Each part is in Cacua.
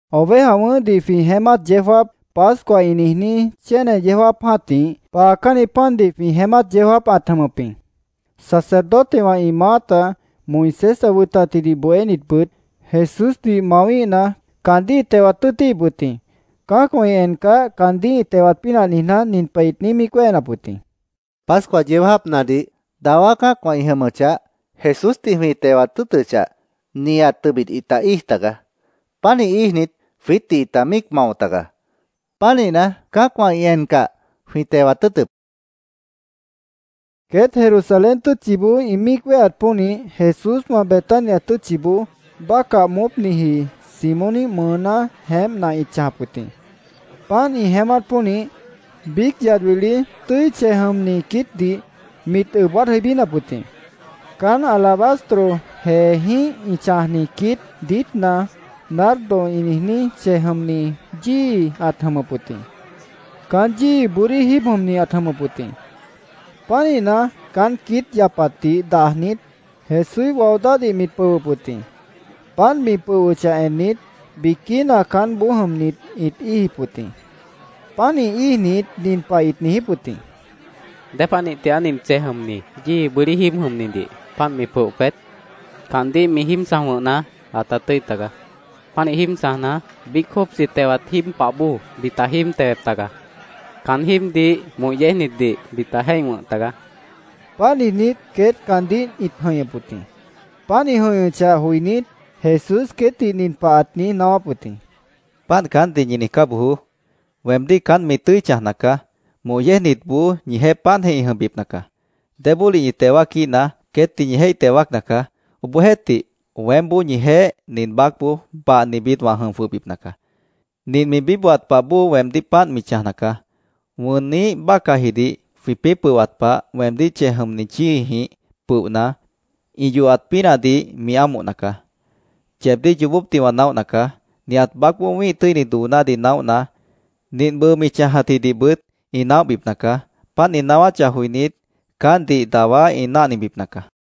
Oveja wʉ̃ʉ́hdih jwĩ jeémát yeó jáap, Pascua ĩ niijní, chéne yeó jáap jã́tih paacánni pandih jwĩ jeémát yeó jáapna ãt jʉmʉp wʉt jĩ. Sacerdotewã ĩ maáta, Moisés ã wʉtatjidih bohénitbʉt Jesúsdih mawíhna, caandíh ĩt tewat tʉ́ʉtíhip wʉt jĩ. Cã́acwã ĩ encah, caandíh ĩ tewat pínah niijná, nin pah ĩt míic niíj wéhenap wʉt jĩ: —Pascua yeó jáapnadih, dawá cã́acwã ĩ jʉmʉchah, Jesúsdih jwĩ tewat tʉ́ʉtʉchah, nihat tʉbit ĩta íij tagaá. Pánih íijnit, jwiítdih ĩta míic mao tagaá. Pánihna, cã́acwã ĩ encah, jwĩ tewat tʉ́ʉtʉ́p, ĩt niijíp wʉt jĩ. Queét Jerusalén tʉ́tchiboó ĩ míic wéheat pónih, Jesúswã Betania tʉ́tchiboó bácah moópniji Simóníh mʉʉná jeémpna ĩt chãjap wʉt jĩ. Páant ĩ jeémát pónih, biíc yad wili tʉ́i chej jʉmni quiítdih mit ʉb waád jʉibínap wʉt jĩ. Caán alabastro jeejĩ́h ĩ chãjni quiít diítna nardo ĩ niijní chej jʉmni yíi ãt jʉmʉp wʉt jĩ. Caán yíi bʉ́dí jíib jʉmni ãt jʉmʉp wʉt jĩ. Pánihna, caán quiít yapatdih dajnit, Jesúíh wao dáhdih mit pʉhwʉp wʉt jĩ. Páant mi pʉhwʉchah ennit, biquína caánboó jʉmnit ĩt íijip wʉt jĩ. Pánih íijnit, nin pah ĩt niijíp wʉt jĩ: —¿Dépanih tigaá nint chej jʉmni yíi bʉ́dí jíib jʉmnidih páant mi pʉoh peét? Caandíh mi jíib chãj wʉ̃hna, ãta tʉ́i tagaá. Pánih jíib chãjna, biíc jópchi tewat jíib pah bóo mita jíib tewep tagaá. Caán jíibdih moh yéejnitdih mita jéih wʉ̃h tagaá, ĩt niijíp wʉt jĩ. Páant niijnít, queét caántdih ĩt jʉ̃ihñʉp wʉt jĩ. Páant ĩ niíj jʉ̃ihñʉchah joinít, Jesús queétdih nin pah ãt niíj naáwáp wʉt jĩ: —Páant caántdih ñi niijcá bojoó. Weemdíh caánt mi tʉ́i chãjna caá. Moh yéejnitboó ñijeéh páantjeh ĩ jʉmbipna caá. Débólih ñi teo wáaquíhna, queétdih ñi jéih teo wáacna caá. Obohjeéhtih, weémboó ñijeéh nin baácboó bahnibit wã jʉm jwʉhbipna caá. Nint mi bíbohat pah bóo weemdíh páant mi chãjna caá. Wʉnniíh bácahjidih jwĩpĩ́ pʉhwat pah, weemdíh chej jʉmni yíijĩh pʉohna, ĩ yohat pínahdih mi ámohna caá. Yeebdíh yoobópdih wã naóhna caá. Nihat baácboó wĩ́ih tʉ́ini doonádih naóhna, nint bʉʉ mi chãjatjidihbʉt ĩ naóhbipna caá. Páant ĩ naáwáchah joinít, caántdih dawá ĩ náhnibipna caá, Jesús ãt niijíp wʉt jĩ.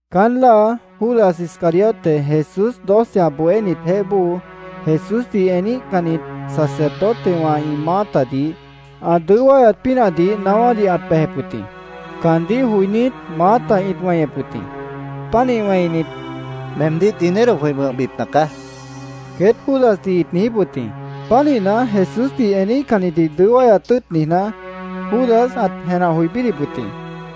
Caán láa, Judas Iscariote, Jesús doce ã bohénitjeéh bóo, Jesúsdih eníhcannit sacerdotewã ĩ maátadih ã dʉó wáyat pínahdih naáwádih ãt bejep wʉt jĩ. Caandíh joinít, maáta ĩt weñep wʉt jĩ. Pánih wẽinit, —Meemdíh dinero jwĩ wʉ̃hbipna caá, queét Judasdih ĩt niijíp wʉt jĩ. Pánihna, Jesúsdih eníhcannitdih dʉó wáyat tʉ́ʉt niijná, Judas ãt jenah joi bídip wʉt jĩ.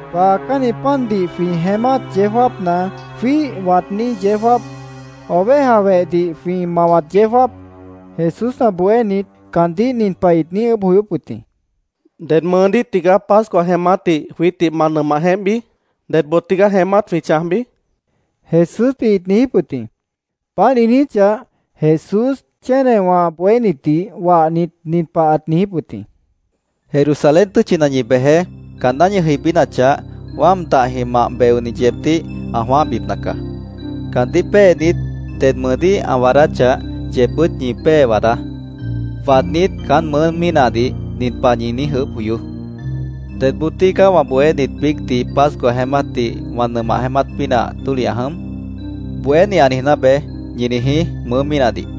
Paacánni pandih jwĩ jeémát yeó jáapna jwíih waadní yeó jáap, oveja wehdih jwĩ mawat yeó jáap, Jesús ã bohénit caandíh nin pah ĩt niíj ʉʉ́bh joyóp wʉt jĩ: —¿Ded mʉʉdíh tigaá Pascua jeémátdih jwiítdih ma nʉmah jeémpbi? ¿Dedboo tígaá jeémát jwĩ chãjbi? Jesúsdih ĩt niijíp wʉt jĩ. Páant ĩ niijíchah, Jesús chénewã ã bohénitdih wahnit, nin pah ãt niijíp wʉt jĩ: —Jerusalén tʉ́tchina ñi bejeé. Caanná ñi jʉibínachah, wáam dahjĩh mah beoni yeebdíh ã jwãáhbipna caá. Caandíh péenit, ded mʉʉdíh ã waadáchah, yeebbʉ́t ñi pée waadá. Waadnít, caán mʉʉ́ mínahdih nin pah ñi niíj ʉʉ́bh joyoó: ‘ “¿Dedboo tígaá wã bohénit biícdih Pascua jeémátdih wã nʉmah jeémát pínah tólih ã jʉm?” Bohéni ã niijná be’, ñi niijí mʉʉ́ mínahdih.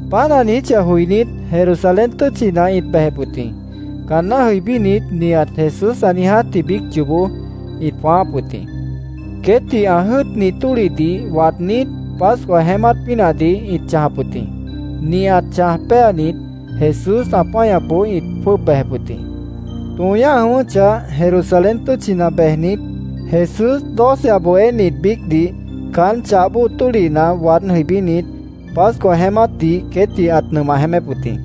Páant ã niijíchah joinít, Jerusalén tʉ́tchina ĩt bejep wʉt jĩ. Caanná jʉibínit, nihat Jesús ã niijátji biíc yoobó ĩt jwãááp wʉt jĩ. Queétdih ã jʉ́ʉtni tólihdih waadnít, Pascua jeémát pínahdih ĩt chãjap wʉt jĩ. Nihat chãj péanit, Jesús ã páñapboó ĩt jwʉ́ʉb bejep wʉt jĩ. Tõo ñáh jʉ̃ʉ́wʉ́chah, Jerusalén tʉ́tchina bejnit, Jesús doce ã bohénit biícdih caán chah bóo tólihna waád jʉibínit, Pascua jeémátdih queétdih ãt nʉmah jeémép wʉt jĩ.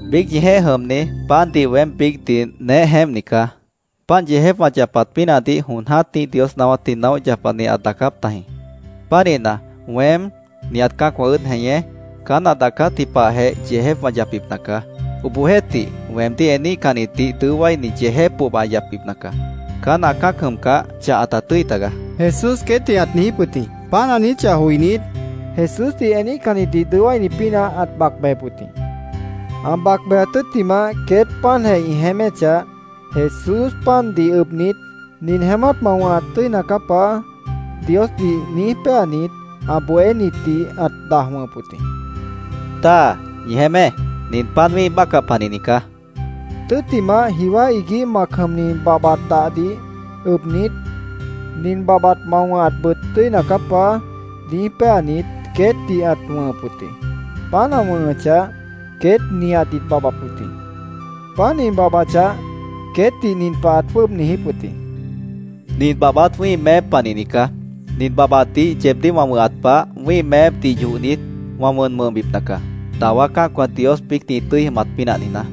—Biíc ñijeéh jʉmni, pandih weém biícdih neéh jeémpni caá. Páant yeejép wã yapat pínahdih jon jã́tih Dios naáwátdih naóh yapani ãt daacáp tajĩ. Pánihna, weém, nihat cã́acwã ʉ́ʉd jeñé, caán ã daacátji pahjeh yeejép wã yapbipna caá. ¡Obohjeéhtih, weemdíh eníhcannitdih dʉó wáini yeejép pohba ã yapbipna caá! Caán ã cã́ac jʉmcah, chah ãta tʉ́i tagaá, Jesús queétdih ãt niijíp wʉt jĩ. Páant ã niijíchah joinít, Jesúsdih eníhcannitdih dʉó wáini pínah ãt bac bejep wʉt jĩ. Ã bac bejat tʉ́ttimah, queét páantjeh ĩ jeéméchah, Jesús pandih ʉbnit, “Nin jeémát ma wʉ̃hat tʉ́ina caá, Paá”, Diosdih niíj péanit, ã bohénitdih ãt daj wʉ̃hʉp wʉt jĩ. —¡Dáa, ñi jeémé! Nin pan wĩ́ih bácah panihni caá, ãt niijíp wʉt jĩ. Tʉ́ttimah, jiwá iguíh mac jʉmni babhbat dahdih ʉbnit, “Nin babhbat ma wʉ̃hatbʉt tʉ́ina caá, Paá”, niíj péanit, queétdih ãt wʉ̃hʉp wʉt jĩ. Páant ã wʉ̃hʉchah, queét nihat ĩt babhbap wʉt jĩ. Páant ĩ babhbachah, queétdih nin pah ãt jwʉ́ʉb niijíp wʉt jĩ: —Nin babhbat wĩ́ih meép panihni caá. Nin babhbatdih yeebdíh wã wʉ̃hat pah, wĩ́ih meépdih yohnit, wã wʉn wʉ̃hbipna caá, dawá cã́acwã Dios biícdih ĩ tʉ́i jʉmat pínah niijná.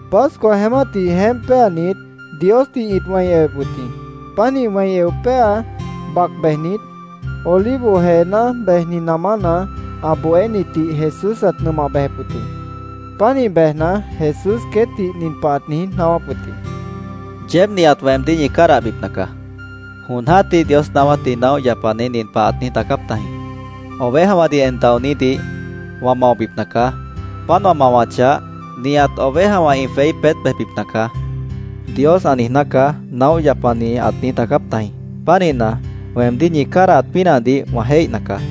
Pascua jeémátdih jeémp péanit, Diosdih ĩt wẽi ewep wʉt jĩ. Pánih eo péa, bac bejnit, Olivo jeená bejni namána ã bohénitdih Jesús ãt nʉmah bejep wʉt jĩ. Pánih bejna, Jesús queétdih nin pah ãt niíj naáwáp wʉt jĩ: —Yeéb nihat weemdíh ñi cádahbipna caá. Jon jã́tih Dios naáwátdih naóh yapani nin pah ãt niíj daacáp tajĩ: ‘ “Ovejawãdih en daonídih wã maobipna caá. Páant wã mawachah, nihat ovejawã ĩ jweí peét bejbipna nacaá”, Dios ã niijná caá’, naóh yapani ãt niíj daacáp tajĩ.Pánihna, weemdíh ñi cádahat pínahdih wã jéihna caá.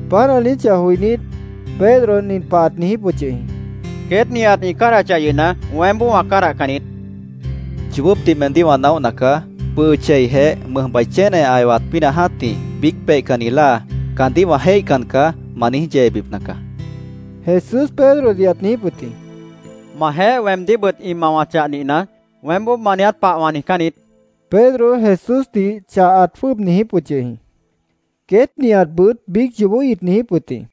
Páant ã niijíchah joinít, Pedro nin pah ãt niijíp wʉt yʉh jĩ: —Queét nihat ĩ cádahachah yʉhna, weémboó wã cádahcan niít, ãt niijíp wʉt jĩ. —Yoobópdih meemdíh wã naóhna caá. Bʉʉ cheijeh mʉjbai chéne ã ewat pínah jã́tih biíc peihcanni láa ‘¡Caandíh wã jéihcan caá!’ ma niíj yeebipna caá, Jesús Pedrodih ãt niijíp wʉt jĩ. —Majeéh weemdíhbʉt ĩ mawachah nihna, weémboó ma niiját pah wã niijcán niít, Pedro Jesúsdih chah ãt jwʉ́ʉb niijíp wʉt yʉh jĩ. Queét nihatbʉt biíc yoobó ĩt niijíp wʉt jĩ.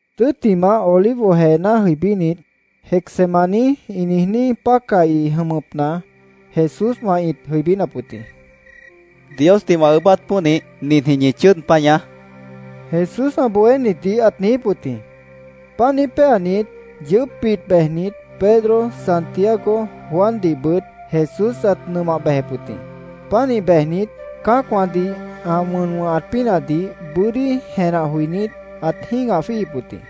Tʉ́ttimah, Olivo jeená jʉibínit, Getsemaní ĩ niijní pácahi jʉmʉpna Jesúswã ĩt jʉibínap wʉt jĩ. —Diosdih wã ʉʉ́bát pónih, ninjĩh ñi chʉ́ʉd páñaá, Jesús ã bohénitdih ãt niijíp wʉt jĩ. Páant niíj péanit, yʉʉ́pbit bejnit, Pedro, Santiago, Juandihbʉt Jesús ãt nʉmah bejep wʉt jĩ. Pánih bejnit, cã́acwãdih ã wʉn wʉ̃hat pínahdih bʉ́dí jenah joinít, ãt jĩ́gah jwíihip wʉt jĩ.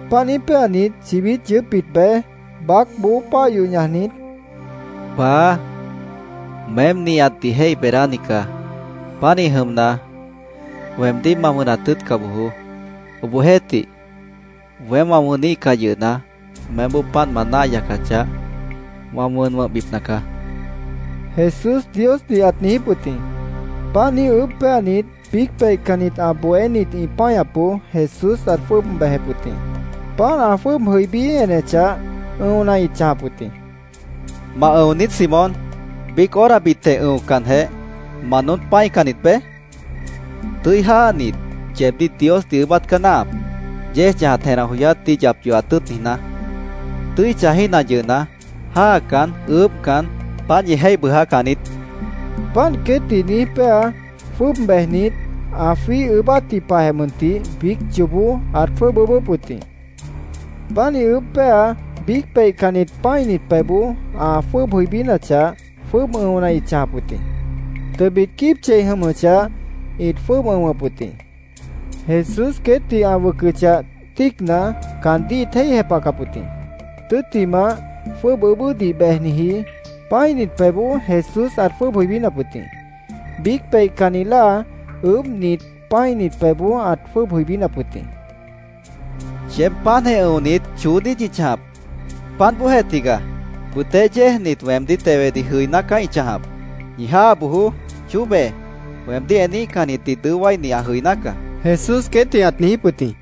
Páant niíj péanit, chibít yʉʉ́pbit bej, baácboó páah yoh ñajnit, “Paá, meém nihatdih jéih beedáni caá. Pánih jʉmna, ¡Weemdíh ma wʉnat tʉ́ʉtca bojoó! Obohjeéhtih, weém wã wʉníhcah yʉhna, meémboó páant ma náah yacachah, wã wʉn wʉ̃hbipna caá”, Jesús Diosdih ãt niijíp wʉt jĩ. Páant niíj ʉʉ́bh péanit, biíc peihcannit ã bohénit ĩ páñapboó Jesús ãt jwʉ́ʉb bejep wʉt jĩ. Páant ã jwʉ́ʉb jʉibí enechah, ʉ̃ona ĩt chãjap wʉt jĩ. —¿Ma ʉ̃o niít, Simón? ¿Biíc horabitjeh ʉ̃ocanjeh, ma noón pã́icannit beé? Tʉ́i jáanit, yeebdíh Diosdih ʉʉ́bát caá náahap, yéej chãjat jenah joyátdih yap yohat tʉ́ʉt niijná. Tʉ́i chãjíhna yʉhna, jáacan, ʉʉ́bhcan, páant ñi jéih bʉʉjácan niít, Jesús ãt niijíp wʉt jĩ. Páant queétdih niíj péa, jwʉ́ʉb bejnit, ã jwíih ʉʉ́bátji pahjeh mʉntih biíc yoobó ãt jwʉ́ʉb ʉʉ́bʉ́p wʉt jĩ. Pánih ʉʉ́bh péa, biíc peihcannit pã́init pebhboó ã jwʉ́ʉb jʉibínachah, jwʉ́ʉb ʉ̃ona ĩt chãjap wʉt jĩ. Tʉbit quíib chei jʉmʉchah, ĩt jwʉ́ʉb ʉ̃wʉp wʉt jĩ. Jesús queétdih ã wʉcʉchah, tíicna, caandíh ĩt jéih jepahcap wʉt jĩ. Tʉ́ttimah, jwʉ́ʉb ʉʉ́bʉ́dih bejniji, pã́init pebhboó Jesús ãt jwʉ́ʉb jʉibínap wʉt jĩ. Biíc peihcanni láa ʉʉ́bhnit, pã́init pebhboó ãt jwʉ́ʉb jʉibínap wʉt jĩ. —¿Yeéb páantjeh ʉ̃onit, choó niít ñi chãjap? ¡Páant bóojeh tigaá! Bʉtéh yéejnit weemdíh tewedih jʉiná caá ĩ chãjap. Ñi jáa bojoó. Chóbe. Weemdíh eníhcannitdih dʉó wáini ã jʉiná caá, Jesús queétdih ãt niijíp wʉt jĩ.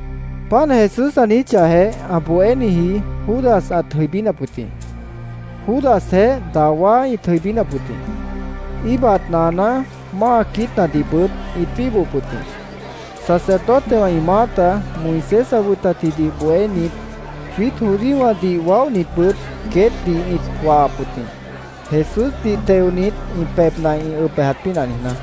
Páant Jesús ã niijíchahjeh, ã bohéniji Judas ãt jʉibínap wʉt jĩ. Judasjeéh dawá ĩt jʉibínap wʉt jĩ. Íibat naaná, máa quiítnadihbʉt ĩt bíbohop wʉt jĩ. Sacerdotewã ĩ maáta, Moisés ã wʉtatjidih bohénit, jwiít judíowãdih waóhnitbʉt queétdih ĩt wahap wʉt jĩ, Jesúsdih teonit, ĩ pebhna ĩ ʉb bejat pínah niijná.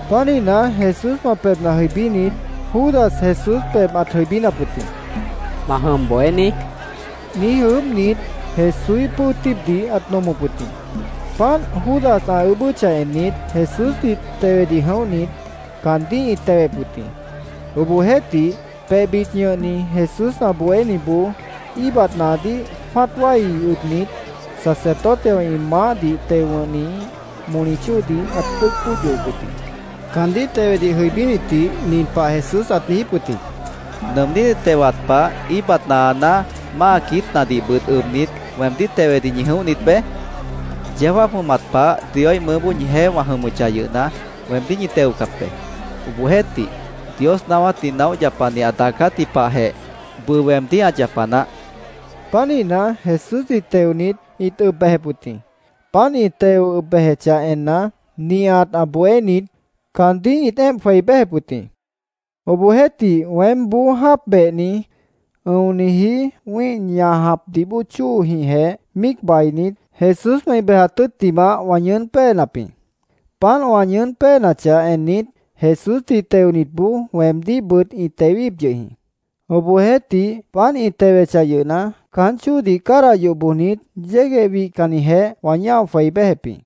Pánihna, Jesúswã pebhna jʉibínit, Judas Jesús pebh ãt jʉibínap wʉt jĩ. —¿Ma jʉm, Bohéní? niíj ʉʉ́bhnit, Jesúíh pʉ́o tíibdih ãt nomop wʉt jĩ. Páant Judas ã ʉʉ́bʉ́chah ennit, Jesúsdih tewedih jʉ̃óhnit caandíh ĩt tewep wʉt jĩ. Obohjeéhtih, pebhbit ñʉhni Jesús ã bohéniboó íibat naadíh jwã́at wái ʉbnit, sacerdotewã ĩ maáhdih teo wʉ̃hniíh moli chóodih ãt dʉ́ʉc bóod yohop wʉt jĩ. Caandíh tewedih jʉibínitdih nin pah Jesús ãt niijíp wʉt jĩ: —¿Nʉʉmnídih tewat pah íibat naaná, máa quiítnadihbʉt ʉbnit, weemdíh tewedih ñi jʉ̃óhnit beé? Yeó jáap jʉmat pah Dioíh mʉʉ́boó ñijeéh wã jʉmʉchah yʉhna, weemdíh ñi teocap be.Obohjeéhtih, Dios naáwátdih naóh yapani ã daacátji pahjeh bʉʉ weemdíh ã yapa naáh, ãt niijíp wʉt jĩ. Pánihna, Jesúsdih teonit, ĩt ʉb bejep wʉt jĩ. Páant ĩ teo bejechah enna, nihat ã bohénit caandíh ĩt éemp jwei béjep wʉt jĩ. Obohjeéhtih, weémboó jáap behni, ʉ̃oniji wĩ́ih ñajapdih bóo chóojĩhjeh míic bainit, Jesúswã ĩ bejat tʉ́ttimah wã ñʉʉ́n péenap jĩ. Páant wã ñʉʉ́n péenachah ennit, Jesúsdih teonitboó weemdíhbʉt ĩ tewep yʉh jĩ. Obohjeéhtih, páant ĩ tewechah yʉhna, caán chóodih cádah yoh bojnit, yégueh wihcannijeh wã ñáo jwei béjep jĩ.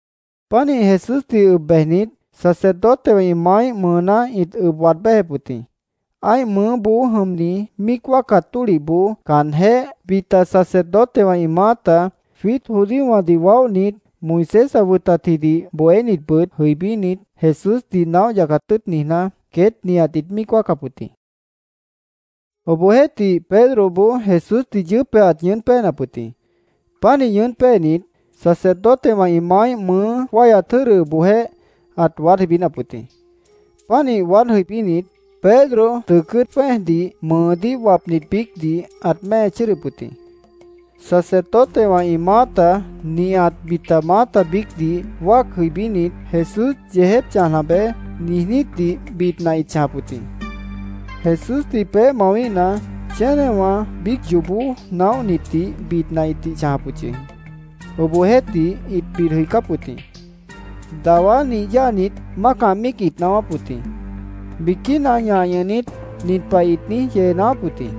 Pánih Jesúsdih ʉb bejnit, sacerdotewã ĩ maáíh mʉʉná ĩt ʉb waad béjep wʉt jĩ. Ã́ih mʉʉ́boó jʉmni míic wáacat tólihboó caanjéh, bita sacerdotewã ĩ maáta, jwiít judíowãdih waóhnit, Moisés ã wʉtatjidih bohénitbʉt jʉibínit, Jesúsdih naóh yacat tʉ́ʉt niijná, queét nihat ĩt míic wáacap wʉt jĩ. Obohjeéhtih, Pedroboó Jesúsdih yʉʉ́pjeh ãt ñʉʉ́n péenap wʉt jĩ. Pánih ñʉʉ́n péenit, sacerdotewã ĩ maáíh mʉʉ́ wáihyat jʉ́dʉboojéh ãt waád jʉibínap wʉt jĩ. Pánih waád jʉibínit, Pedro tʉʉ cʉ́ʉt jwẽ́ejdih, mʉʉdíh wapnit biícdih, ãt mée chʉ́ʉdʉp wʉt jĩ. Sacerdotewã ĩ maáta, nihat bita maáta biícdih wáac jʉibínit, “Jesús yeejép chãjna beé”, niijnítdih bidna ĩt chãjap wʉt jĩ. Jesúsdih peéh mawíhna, chénewã biíc yoobó naóhnitdih bidna ĩtih chãjap wʉt yʉh jĩ. Obohjeéhtih, ĩt bid jʉicáp wʉt jĩ. Dawá nih yáanit, mácah míic ĩt naáwáp wʉt jĩ. Biquína ñah ñʉhnit, nin pah ĩt niíj yee naáwáp wʉt jĩ: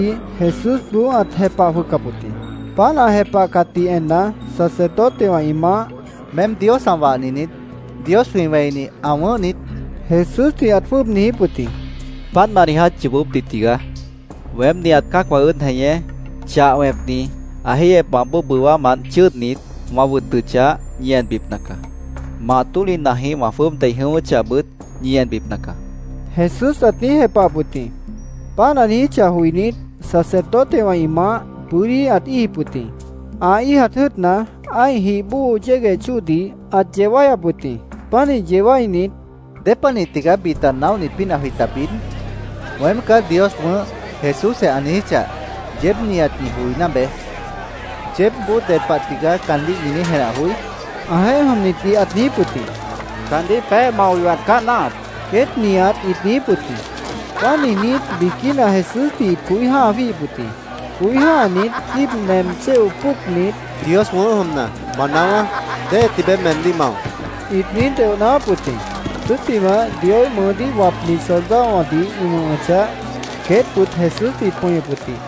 Obohjeéhtih, Jesúsboó ãt jepah jwʉhcap wʉt jĩ. Páant ã jepahcatdih enna, sacerdotewã ĩ maáh —¿Meém Dios ã wahni niít? ¿Dios, jwĩ wẽini, ã wʉ̃ʉ́h niít? Jesúsdih ãt jwʉ́ʉb niijíp wʉt jĩ. —Páant ma niiját yoobópdih tigaá. Weém nihat cã́acwã ʉ́ʉd jeñé Chah Wẽpni ã jéihyepmant bóo bʉwámant chʉ́ʉdnit, wã wʉtʉchah, ñi enbipna caá. Mah tólihnajih wã jwʉ́ʉb dei jʉ̃ʉ́wʉ́chahbʉt ñi enbipna caá, Jesús ãt niíj jepahap wʉt jĩ. Páant ã niijíchah joinít, sacerdotewã ĩ maáh bʉ́dí ãt íijip wʉt jĩ. Ã íijat jʉ́ʉtna, ã́ih jih bóo yégueh chóodih ãt yeo wáyap wʉt jĩ. Pánih yeo wáinit, —¿Dépanih tigaá bita naóhnit pínah jwĩta bid? ‘Weém caá Dios wʉ̃ʉ́h’, Jesúsjeh ã niijíchah, yeéb nihat ñi joiná be. ¿Yeébboó ded pah tigaá caandíh ñi niíj jenah joí? ãjeéh jʉmnitdih ãt niijíp wʉt jĩ. —Caandíh peéh mao yohat caá náahap, queét nihat ĩt niijíp wʉt jĩ. Páant niijnít, biquína Jesúsdih ĩt coí jã́ha jwíihip wʉt jĩ. Coí jã́hanit, quíib nem chéo póocnit, —Dios wʉ̃ʉ́h jʉmna, ma naáwá ¿déhe tibeé meemdíh mao? ĩt niíj deoh naáwáp wʉt jĩ. Tʉ́ttimah, Dioíh mʉʉdíh wapnit soldadowãdih ĩ wʉ̃hʉchah, queétbʉt Jesúsdih ĩt pʉñʉp wʉt jĩ.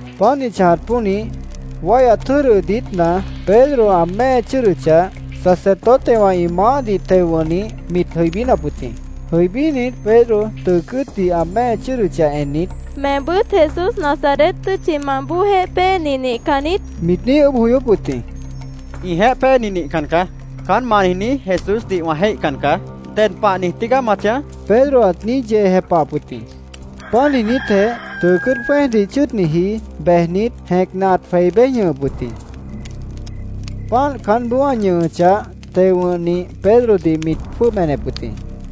Páant ĩ chãjat pónih, wáihyat jʉ́dʉ diítna Pedro ã mée chʉ́ʉdʉchah, sacerdotewã ĩ maáhdih teo wʉ̃hnih mit jʉibínap wʉt jĩ. Jʉibínit, Pedro tʉʉ cʉ́ʉtdih ã mée chʉ́ʉdʉchah ennit, —¿Meembʉ́t Jesús Nazaret tʉ́tchimant bóojeéh péeni nihcan niít? mit niíj ʉʉ́bh joyóp wʉt jĩ. —Ĩjeéh péeni nihcan caá. Caán ma niijní Jesúsdih wã jéihcan caá. ¿Ded pah niij tígaá ma chãj? Pedro ãt niíj yee jepahap wʉt jĩ. Páant niijnítjeh, tʉʉ cʉ́ʉt jwẽ́ejdih chʉ́ʉdniji bejnit, jẽcna ãt jwei béj ñʉhʉp wʉt jĩ. Páant caánboó ã ñʉhʉchah, teo wʉ̃hnih Pedrodih mit jwʉ́ʉb enep wʉt jĩ.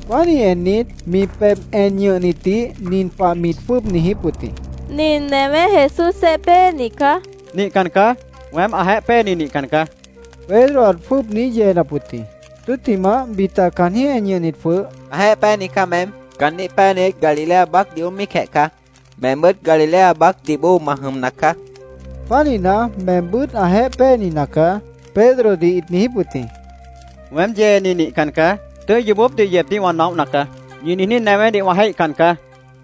Pánih ennit, mi pebh en ñʉhnitdih nin pah mit jwʉ́ʉb niijíp wʉt jĩ: —Nin newé Jesúsjeéh péeni caá, mit niijíp wʉt jĩ. —Nihcan caá. Weém ãjeéh péeni nihcan caá, Pedro ãt jwʉ́ʉb niíj yeenap wʉt jĩ. Tʉ́ttimah, bita caanjĩ́h en ñʉhnit jwʉh —Ãjeéh péeni caá meém. Caandíh péenit Galilea baácdih moón míicjeh caá. Meembʉ́t Galilea baácdih bóo ma jʉmna caá. Pánihna, meembʉ́t ãjeéh péeni nacaá, Pedrodih ĩt niijíp wʉt jĩ. —Weém yeeni nihcan caá. Tʉ́i yoobópdih yeebdíh wã naóhna caá. ¡Ñi niijní newédih wã jéihcan caá!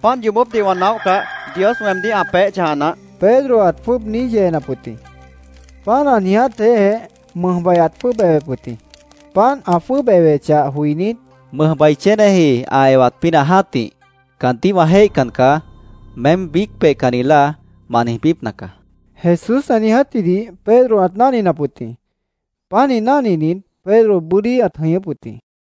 ¡Páant yoobópdih wã naóhcah, Dios weemdíh ã peéh chãja naáh! Pedro ãt jwʉ́ʉb niíj yeenap wʉt jĩ. Páant ã niijátjeéhjeh, mʉjbai ãt jwʉ́ʉb ewep wʉt jĩ. Páant ã jwʉ́ʉb ewechah joinít, “Mʉjbai chéneji ã ewat pínah jã́tih ‘Caandíh wã jéihcan caá’, meém biíc peihcanni láa ma niijbípna caá”, Jesús ã niijátjidih Pedro ãt náhninap wʉt jĩ. Pánih náhninit, Pedro bʉ́dí ãt jʉñʉ́p wʉt jĩ.